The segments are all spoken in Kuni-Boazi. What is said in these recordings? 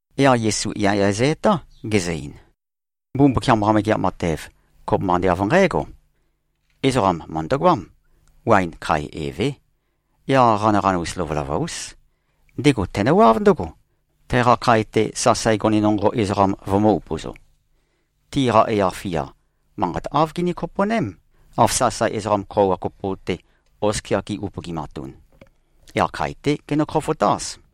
Yaq Yesu yaya zø-etá, gezø-ein, “Mbumbukiam-qa Megeat Matev, kopømba ande av nqǽgo: Ezoqam mø̀ndøgoám. Waen khae evé. Yaq qanaqanus lovølova-ús. Ndego tenøwáv ndǿgo, teqa khae-te sasae gone nonqo ezoqam vømø̄-upøzo. Tiqa yaq-fia, manqat āv gini-kopo꞉ném, av sasae ezoqam khøuwa kopo-te, oskia gi-upøgimatun. Yaq khae-té genø-khofotáz.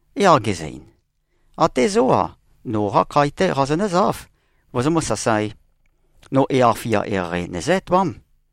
Yaq gezø-ein, ‘Até zó-a, noqá khae-té qazonǿzáv, vozomǿ-sasaē. No yaq-fia eqeieqei nøzǿ-etoám.’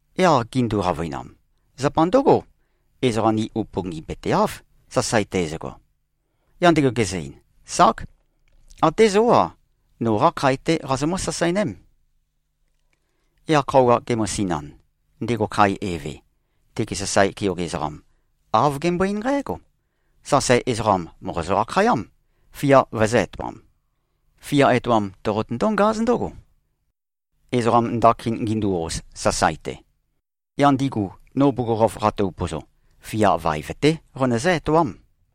Yaq gindu-qavøinam, ‘Zapa ndǿgo, ezoqa ni upøngipøteáv, sasae teizøgo.’ Yaq ndego gezø-ein, ‘Ság! Até zó-a. Noqá khae-té qazomǿ-sasaeném.’ Yaq khøuwa gemøsinan, ndego khae eve, tege sasae keoge ezoqam, āv gembøe-eín nqǽgo, ‘Sasae ezoqam mòqozø-akhayám, fia vøzø̄-etoam. Fia etoam toqotøndó-ngáz ndǿgo, ezoqam ndakin gindu-oz, sasae-te. Yaq ndigu, no bugukhokhof qato-upøzo, fia vaev-té qonøzǿ-etoám.’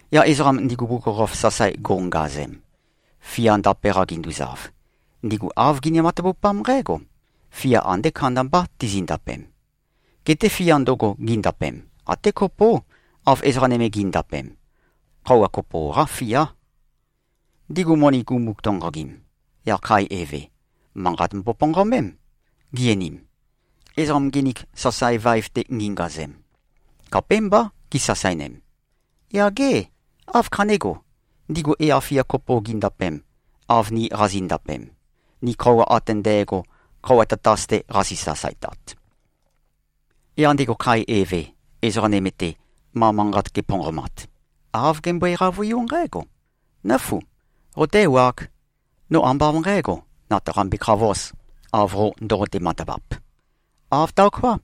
Yaq ezoqam ndigu bugukhokhof sasae go꞉ngazem, fia ndape-qa ginduzav, ndigu āv gini-matavupám nqǽgo: Fia andé kandambá tizindapem. Geté fia ndøgo gindapem, até kopó, av ezoqa nøme gi꞉ndapem. Khøuwa kopo-qá fiá. Ndigu moni gumu-tonqogim, yaq khae eve, manqat mboponqomém, gi-einim, ‘Ezoqam nginik, sasae vaev-te gingazem, khapémbá gisasaenem. Yaq gê, áv khanégo, ndigu yaq-fia kopo gindapem, av ni qazi꞉ndapem, ni khøuwa ate ndægo, khøuwa tatas-te qazi-sasaetat?’ Yaq ndego khae eve, ezoqa nøme-te, ma manqat geponqomat, āv gembøe-qavøiú nqǽgo, ‘Nǿfu! Qoté-ewāg. No ambá av nqǣgo, nøtaqambe-khavōz, av qo ndoqote-matavap. Āv taoká.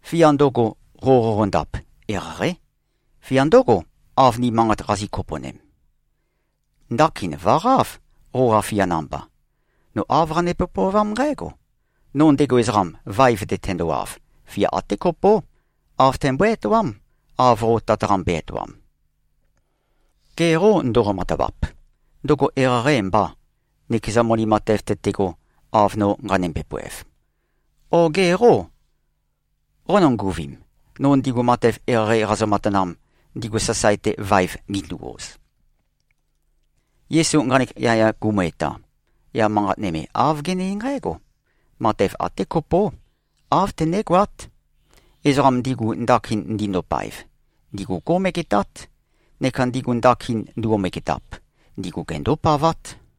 Fia ndøgo, qo qoqondap, eqeieqeí. Fia ndǿgo, av ni manqat qazi꞉-kopo꞉nem. Ndakin vø̀qáv, qoqa fia namba. No āv qanømbe-pøovám nqǽgo: No ndego ezoqam, vaev-te tendowav, fia até kopó, āv tæmbøé-etoám, av qo tøtaqambe-etoam. Ge qô ndoqo-matavap? Ndøgo eqeieqeî mbà, nøkeza moni matev tøtego, av no nqanømbe-poev? O ge qô, qónønguvim, no ndigu matev eqeieqei qazø-matanam, ndigu sasae-te vaev gindu-oz?’” Yesu nqanek yaya gumu-eta, yaq manqat nøme āv gene-eín nqǽgo, “Matev até kopó, āv tønégoát. Ezoqam ndigu, ndakin ndindopaev, ndigu gó꞉megetát. Neka ndigu ndakin nduo-megetap, ndigu gendópavát.”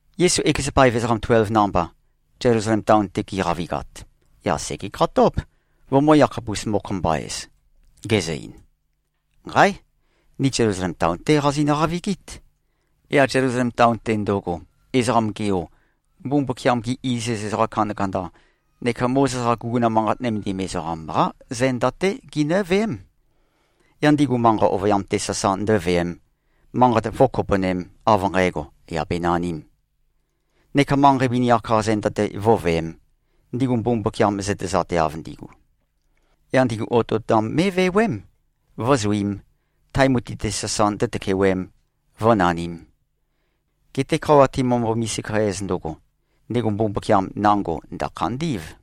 Yesu ekeza paev ezoqam tuelv namba, Zelusalem taon-te gi꞉qavigat, yaq sègekhatób, vømø̄-yakhapus-mokho-mba-ez, gezø-ein, “Nqáe! Ni Zelusalem taon-té qazinø-qavigít. Yaq Zelusalem taon-te ndøgo, Ezoqam-ge Yo, Mbumbukiam-gi iziz ezoqa kandakanda neka Mozes-qa guguna manqat nømendim ezoqam-qá zenda-té ginǿveém. Yaq ndigu manqa ovøyam-te sasa ndǿveēm, manqat vǿkopo꞉nēm, av nqægo, yà benanīm, neka manqei vini-ak-qa zenda-te vǿveēm, ndigu Mbumbukiam zøtezateav ndigu. Yaq ndigu otøotam mé꞉vewém, vǿzuīm, tae mutui-te sasa ndǿtøkewēm, vǿnanīm. Geté khøuwa timømbo-misika-ez ndøgo, ndego Mbumbukiam nango ndø̀khandí꞉v.”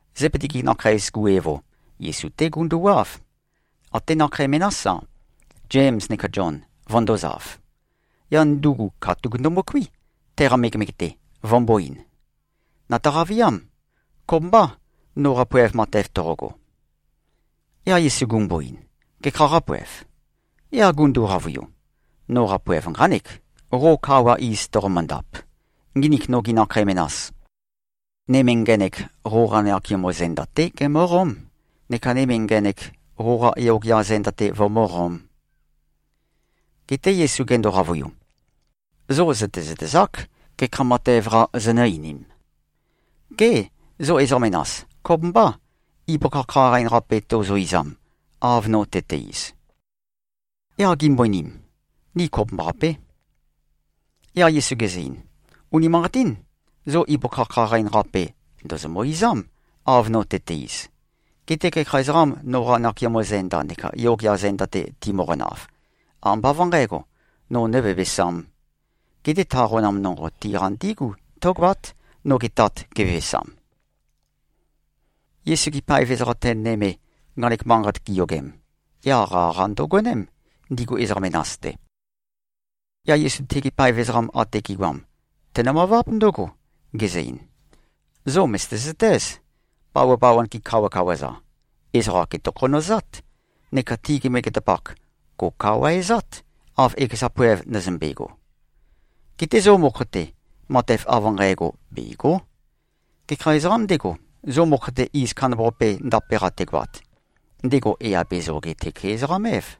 Zebedi-gi nakheis-gu evo, Yesu-té gunduwáv. Até nakhei menás-a, Zems neka Zion, vøndōzav. Yaq ndugu katuk ndømøkuí, teqa megemege-te, vømbō-ein, “Nø̀taqa-viám. Kopømbâ, noqa poev matev toqogo?” Yaq Yesu gumbo-ein, “Gekhā qápoev?” Yaq gundu-qavøiu, “Noqa poev nqánek. Qo kawa iz toqomøndap, nginik nogi nakhei menas, nøme ngenek, qoqa nakeamo zenda-té gemǿqóm, neka nøme ngenek, qoqa yogea zenda-te vømǿqōm.” Geté Yesu gendo-qavøiu, “Zo zø̀tezøtezák, gekha matev-qa zonø̄-einim. Gê, zo ezoqa menas, kopømbâ, ibøkha khaqain-qape tozo-izam, av no tøte-iz?” Yaq gimbo-einim, “Ni kopømbaqapé.” Yaq Yesu gezø-ein, “Unimanqatín. Zo ibøkha khaqain-qape ndòzomø-izám, av no tøte-iz. Geté gekha ezoqām, noqa nakeamo zenda neka yogea zenda-te timøqonav, ambá av nqǣgo, no nǿvevesām. Geté ta qonam nonqo tiqa ndígu tǿgoát, noge Tat gevevesam.” Yesu-gi paev ezoqa ten nøme, nqanek manqat giyogem, yaq qaqa ndøgoném, ndigu ezoqa menas-te. Yaq Yesu tegi paev ezoqam ate gi꞉goam, tenø-møváb ndǿgo, gezø-ein, “Zo mø̀zøte-zøtéz. Bawabawan-gi kawakawa-za, ezoqa gètokhonøzát. Neka tigi megetapak gò꞉kawaezát, av ekeza poev ndøzømbe꞉go. Geté zo mokho-te, matev av nqægo bègo᷄. Gekha ezoqām ndego, zo mokho-te iz kandambaqape ndape-qa tegoat, ndego yà be-zoge-tøke-ezoqam-év.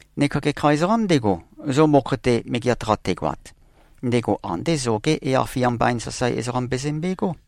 Neka gekha ezoqām ndego, zo mokho-te megeat-qa tegoat, ndego andé zogé yaq-fia mbain sasae ezoqam bezømbegó.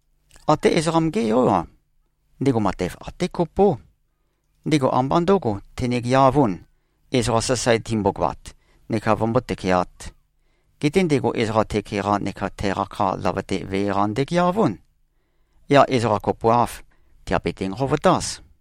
Até Ezoqam-gé Yó-a, ndego matev até kopó. Ndego ambá ndø̄go tenegeavūn, ezoqa sasae timbogoat neka vømbó-tøkeāt. Geté ndego ezoqa tøke-qa neka teqa kha løvøte-te vee-qa ndøgeavún. Yaq ezoqa kopoav, tèabete-nqovotáz.”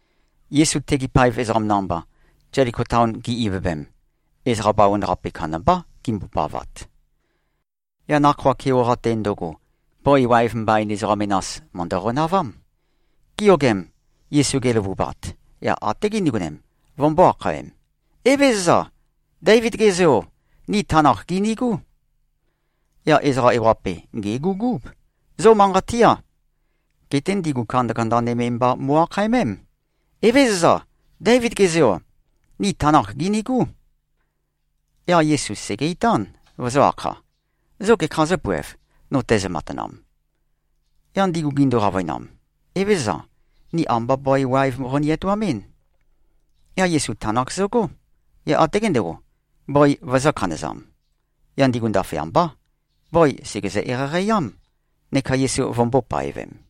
Yesu tegi paev ezoqam namba, Zeliko taon gi꞉-ivøvem, ezoqa bawan-qape kandambá gimbopavat. Yaq nakhoa keoqa-te ndøgo, bøi waev mbain ezoqa menas mø̀ndø-qonavám. Giyogem, Yesu geløvubat, yaq até gindigonem, vømbō-akhaem, “Evézøza! Déivid-ge Zeo! Ni tanakh gìnigú!” Yaq ezoqa ewaqape, gègugúb, “Zo manqat tiá.” Geté ndigu kandakanda nøme mba mo꞉-akhaemém, “Evézøza. Déivid-ge Zeo. Ni tanakh gìnigú.” Yaq Yesu sège-itán, vøzø̄-akha, “Zo gekhā zǿpoev, no tæzø-matanam?” Yaq ndigu gindu-qavøinam, “Evézøza. Ni ambá bøi waev qoni-etoamɨ́n.” Yaq Yesu tanakh zøgó. Yaq até gendego, bøi vøzø̄-khanøzam. Yaq ndigu ndaføyambá, bøi sègezø-eqeieqei-ám, neka Yesu vømbō-paevem.